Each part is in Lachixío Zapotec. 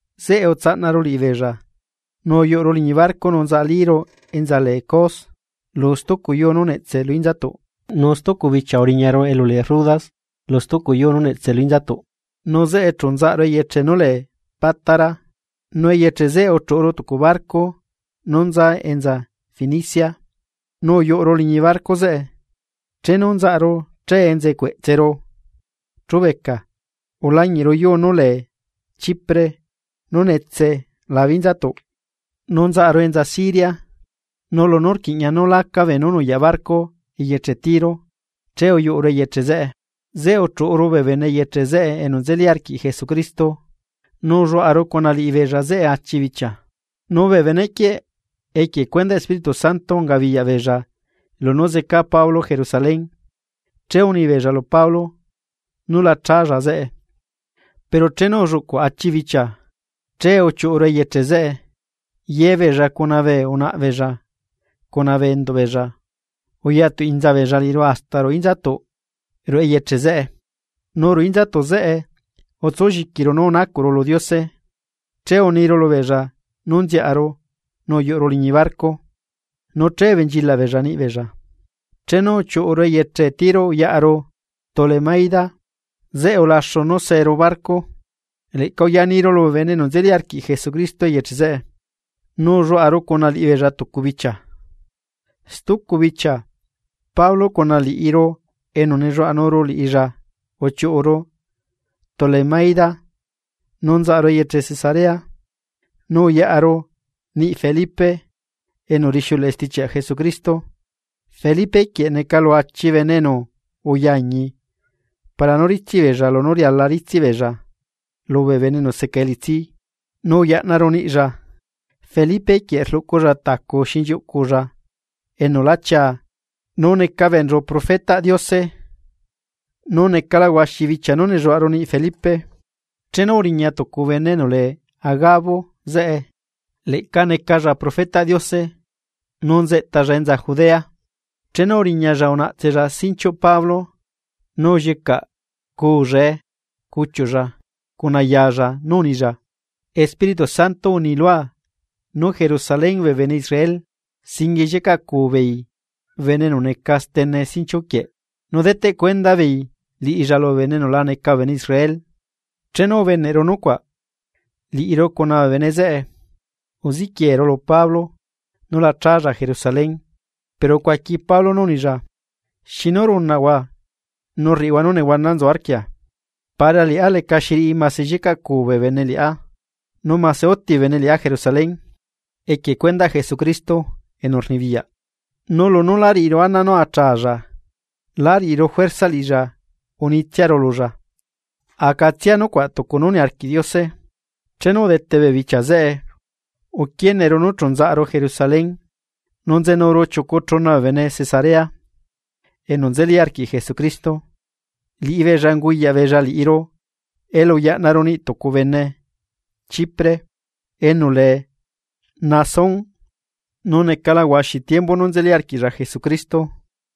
Zeꞌe utsaꞌnaru liꞌibeella, nu uyuꞌuru liñi barco nu nzaꞌalíru enza lee Cos tucu yuu nú netse lu inzatuꞌ, nu stucu bichia uriñaru elu lee Rodas lu stucu yuu nú netse lu inzatuꞌ, nu zeꞌe chu nzaꞌaru eyeche nú lee Pátara. Nu eyeche zeꞌe uchuꞌuru tucu barco nú nza enza Fenicia, nu uyuꞌuru liñi barco zeꞌe. Chenu nzaꞌaru che enza cueꞌtseru chubeca ulañiꞌru yuu nú lee Chipre nú netse labe inzatuꞌ, nu nzaꞌaru enza Siria. Nu lunú rquiꞌña nú laca beenú nuyaꞌ barco eyeche Tiro. Che uyuꞌuru eyeche zeꞌe, zeꞌe uchuꞌuru bee bene eyeche zeꞌe enu nzeli arquiꞌ Jesucristo, nu ulluaꞌaru cuna liꞌibeella zeꞌe achi bichia. Nu bee benequieꞌ equie cuendaꞌ Espíritu Santo ungabiyaꞌbeella lunú zeca Pablo Jerusalén che unibeella lu Pablo nú la challa zeꞌe. Pero chenu ulluꞌcuꞌ achi bichia, che uchiuꞌuru eyeche zeꞌe. Ye beella cuna bee unaꞌbeella cuna bee enduꞌbeella uyatuinza beella liꞌiru hasta ruꞌu inzatuꞌ ruꞌu eyeche zeꞌe, nu ruꞌu inzatuꞌ zeꞌe utsulliquiru nú unacuꞌru lu Diose. Che uniru lubeella nú nziaꞌaru nu uyuꞌuru liñi barco, nu che ubenchilaꞌ beella niꞌbeella. Chenu uchiuꞌuru eyeche Tiro uyaꞌaru Tolemaida, zeꞌe ulaxu nú seeru barco, leꞌca uyaniru lubee bene enu nzeli arquiꞌ Jesucristo eyeche zeꞌe, nu ulluaꞌaru cuna liꞌibeella tucu bichia. Stucu bichia, Pablo cuna liꞌiru enu nelluaꞌanuru liꞌilla uchiuꞌuru Tolemaida nu nzaꞌaru eyeche Cesarea, nu uyaꞌaru niꞌ Felipe enu rixiuleꞌe stichiaꞌ Jesucristo. Felipe quieꞌ neca lu achi bene enu uyañi para nú ritsiꞌ beella lunú riala ritsiꞌ beella lubee bene enu seca elitsi, nu uyaꞌnaru niꞌlla. Felipe quieꞌ rluꞌculla tacu xinchiuꞌculla enu lá chia nu neca beenchu profetaꞌ Diose. Nu necala huaxi bichia nú nelluaꞌaru niꞌ Felipe, chenu uriña tucu bene enu lee Agabo zeꞌe, liꞌilla leꞌca necalla profetaꞌ Diose nu nzeꞌtalla enza Judea. Chenu uriñalla unaꞌtsella sinchiuꞌ Pablo nu ullicaꞌcuullae cuchiuꞌlla cuna yalla nu unilla: ―Espíritu Santo unilua nú Jerusalén bee bene Israel singuie llicaꞌcuu beei bene enu neca steneꞌ sinchiu quieꞌ nu deteꞌ cuenda beei liꞌilla lubee bene enu la neca bee bene Israel. Chenu ubeneꞌru nucuaꞌ, liꞌiru cuna bee bene zeꞌe uziquieru lu Pablo nú la chálla Jerusalén. Pero ucuaqui Pablo nú unilla: ―¿Xinu runaꞌhua nu rriꞌihua nú nehuana nzu arquia? Para liꞌá lecaxi riꞌi mase llicaꞌcuu bee bene liꞌá, nu mase uti bee bene liꞌá Jerusalén equie cuendaꞌ Jesucristo enu rnibiyaꞌ. Nu lunú lá riꞌiru ana nú la challa, lá riaꞌru juerza liꞌilla unitsiaru lulla: ―Acatsia nucuaꞌ tucu nú niarquiꞌ Diose. Chenu udete bee bichia zeꞌe, uquieneru nu chu nzaꞌaru Jerusalén. Nu nzenuru chiucu chuna bee bene Cesarea enu nzeli arquiꞌ Jesucristo, liꞌibeella unguyaꞌ beella liꞌiru elu uyaꞌnaru niꞌ tucu bene Chipre enu lee Nasón, nu necala huaxi tiembu nú nzeli arquiꞌlla Jesucristo.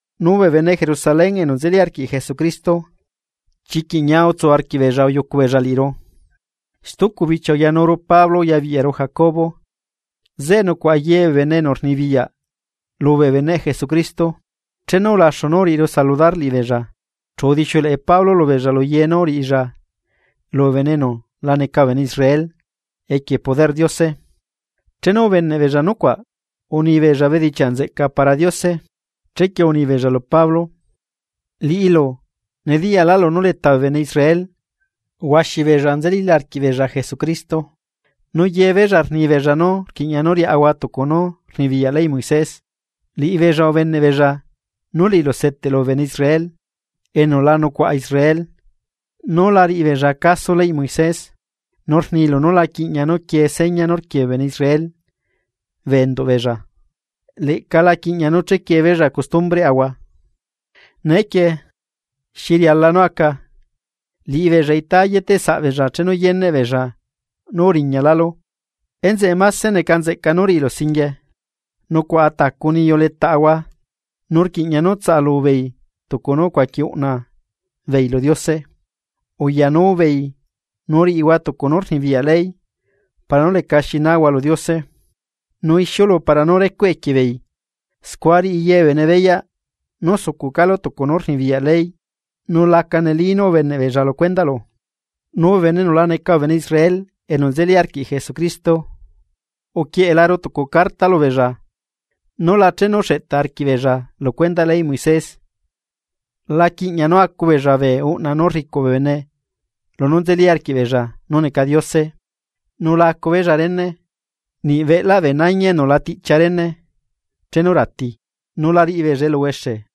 Nu bee bene Jerusalén enu nzeli arquiꞌ Jesucristo, chiquiꞌ ñia utsu arquiꞌbeella uyucu beella liꞌiru. Stucu bichia uyanuru Pablo uyabiꞌyaru Jacobo, zeꞌe nucuaꞌa ye bee bene enu rnibiyaꞌ lubee beneꞌ Jesucristo. Chenu ulaxu nú uriꞌiru saludar liꞌibeella chu udixiuleꞌe Pablo lubeella lu ye nú uriꞌilla lubee bene enu la neca bee bene Israel equie poderꞌ Diose. Chenu ubeneꞌ beella nucuaꞌ, unibeella bedichiaꞌ nzeꞌca lu Diose. Chequie unibeella lu Pablo: ―Liꞌilu nediyaꞌlu nú leta bee bene Israel huaxi beella nzelíla arquiꞌbeella Jesucristo, nu ye beella rni beella nú rquiꞌña nú riaꞌahua tucu nú rnibiyaꞌ leyꞌ Moisés. Liꞌibeella ubeneꞌbeella nú liꞌilu seteꞌlu bee bene Israel enu la nucuaꞌa Israel, nú la riꞌi beella caso leyꞌ Moisés, nu rnilu nú la quiꞌña quiee seña nú rquiee bee bene Israel bee enduꞌ beella, leꞌca la quiꞌña nú chequie beella costumbreaꞌahua. Neequie, ¿xi riala nú aca? Liꞌibeella itá yeteꞌsaꞌ beella chenu yeneꞌ beella nú uriñalálu. Enzeꞌe máse neca nzeꞌca nú riꞌilu singuie: Nucuaꞌa tacu niyu letaꞌahua nu rquiꞌña nú tsaꞌalubeei tucu nú ucuaqui uꞌna beei lu Diose. Uyanubeei nu riꞌihua tucu nú rnibiyaꞌ ley para nú lecaxi náhua lu Diose, nu ixiulu para nú recuꞌ equie beei, scua riꞌi ye bee bene beyaꞌ nú sucuꞌcálu tucu nú rnibiyaꞌ ley nu la neli nú ubeneꞌbeella lu cuendaꞌlu. Nu bee bene enu la neca bee bene Israel enu nzelila arquiꞌ Jesucristo, uquieꞌelaru tucu carta lubeella nú la chenu xeꞌtaꞌ arquiꞌbeella lu cuendaꞌ leyꞌ Moisés. La quiꞌña nú acu beella bee uꞌna nú rricuꞌ bee bene lunú nzeli arquiꞌbeella nú neca diose, nu la acu beella rene, niꞌ beꞌlaꞌ bee nañi enu la tiꞌchia rene chenu rati, nu la riꞌi beella eluhuexe.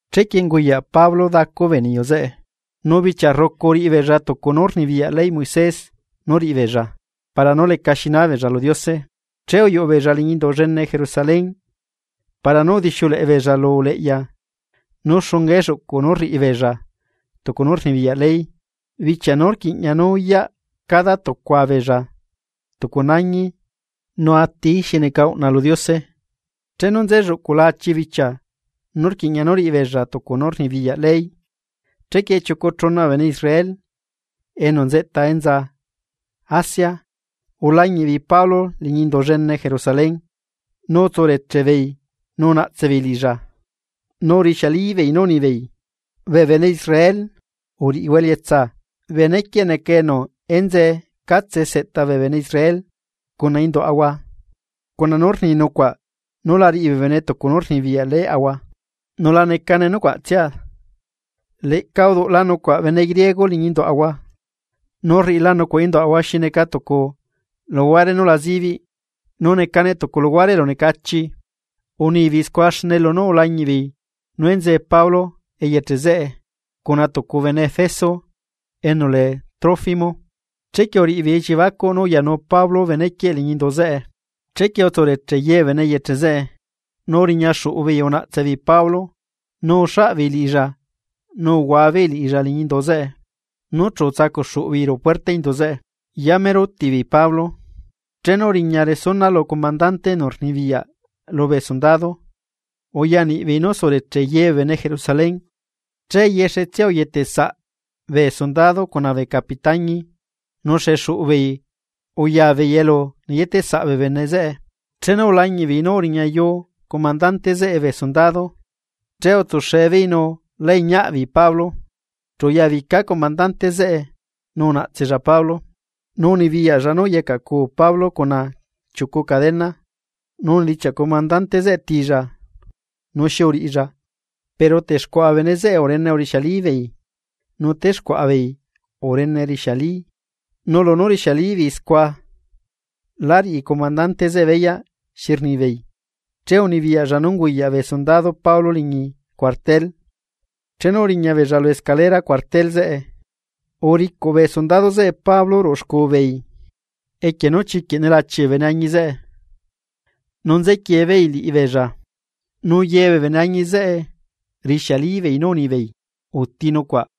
Chequie unguyaꞌ Pablo dacu bee niyu zeꞌe, nu bichia rrucu uriꞌi beella tucu nú rnibiyaꞌ leyꞌ Moisés nú riꞌi beella para nú lecaxi nábeella lu Diose. Che uyuꞌu beella liñi Indu llene Jerusalén para nú udixiuleꞌe beella lu uleꞌya nú xunga elluꞌcuꞌ nú riꞌi beella tucu nú rnibiyaꞌ ley bichia nú rquiꞌña nú uyaꞌ cada tucua beella tucu nañi nu atií xi neca uꞌna lu Diose. Chenu nze lluꞌcula achi bichia nú rquiꞌña nú riꞌi beella tucu nú rnibiyaꞌ ley, chequie chiucu chuna bee bene Israel enu nzeꞌta enza Asia ulañiꞌ beei Pablo liñi Indu llene Jerusalén nu utsureche beei nu unaꞌtse beei liꞌilla, nu rixiali beei nú unibeei: ―¡Bee bene Israel, uriꞌihua elietsa! Benequieꞌ neca enu enzee catse seꞌta bee bene Israel cuna induaꞌahua cuna nú rni nucuaꞌ nú la riꞌi bee bene tucu nú rnibiyaꞌ leyꞌahua, nu la necane nucuaꞌtsia, leꞌca uduꞌla nucuaꞌ bene griego liñi induaꞌahua nu rriꞌila nucuaꞌ induaꞌahua xi neca tucu luhuare nú la zibiꞌ nu necane tucu luhuare elunecachi. Unibeei scua xne lunú ulañiꞌbeei nú enzee Pablo eyeche zeꞌe cuna tucu bene Efeso enu lee Trófimo, chequie uriꞌibeei elliebacuꞌ nú uyanu Pablo benequieꞌ liñi indu zeꞌe. Chequie utsureche ye bee bene eyeche zeꞌe, nu uriña xuꞌu beei unaꞌtse beei Pablo, nu uxaꞌ beei liꞌilla uhua beei liꞌilla liñi indu zeꞌe, nu chu utsacuꞌ xuꞌu beei ruꞌu puerta indu zeꞌe. Yamero uti beei Pablo, chenu uriña resuna lu comandante enu rnibiyaꞌ lubee sundado, uyaniꞌbeei nú sureche ye bee bene Jerusalén. Che yexetsia uyetesaꞌ bee sundado cuna bee capitañi nu xexuꞌu beei uya beei elu neyeteꞌsaꞌ bee bene zeꞌe. Chenu ulañiꞌ beei nú uriñayu comandante zeꞌe bee sundado, che utsuxe beei nu lá iñiaꞌ beei Pablo. Chu uyabica comandante zeꞌe nu unaꞌtsella Pablo, nu unibiyaꞌlla nú uyacaꞌcuu Pablo cuna chiucu cadena, nu unidichiaꞌ comandante zeꞌe tilla nu xi uriꞌilla. Pero texcuaꞌa bee bene zeꞌe urene urixialibeei nu texcuaꞌa beei urene rixiali nu lunú rixiali beei scua, lá riꞌi comandante zeꞌe beyaꞌ xi rnibeei, che unibiyaꞌlla nú unguyaꞌ bee sundado Pablo liñi cuartel. Chenu uriña beella lu escalera cuartel zeꞌe, uricuꞌ bee sundado zeꞌe Pablo ruꞌu xcuu beei equie nú chiquiꞌ nelachi bee beneañi zeꞌe, nu nzequiee beei liꞌibeella; nu ye bee beneañi zeꞌe rixiali beei nú unibeei: ―¡Uti nucuaꞌ!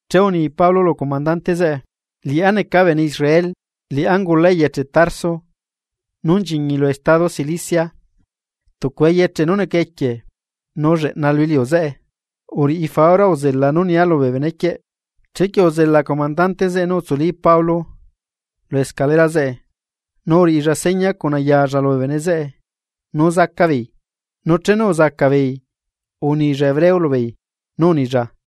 Che uni Pablo lu comandante zeꞌe: ―Liꞌá neca bene Israel, liꞌá ungula eyeche Tarso nú nchiñi lu estado Cilicia, tucu eyeche nu neca equie nu lleꞌna lu iliu zeꞌe. Uriꞌi faura uzela nú nia lubee benequieꞌ. Chequie uzela comandante zeꞌe nu utsuli Pablo lu escalera zeꞌe, nu uriꞌilla seña cuna yalla lubee bene zeꞌe nú zaca beei. Nu chenu uzaca beei unilla hebreo lubeei nú unilla: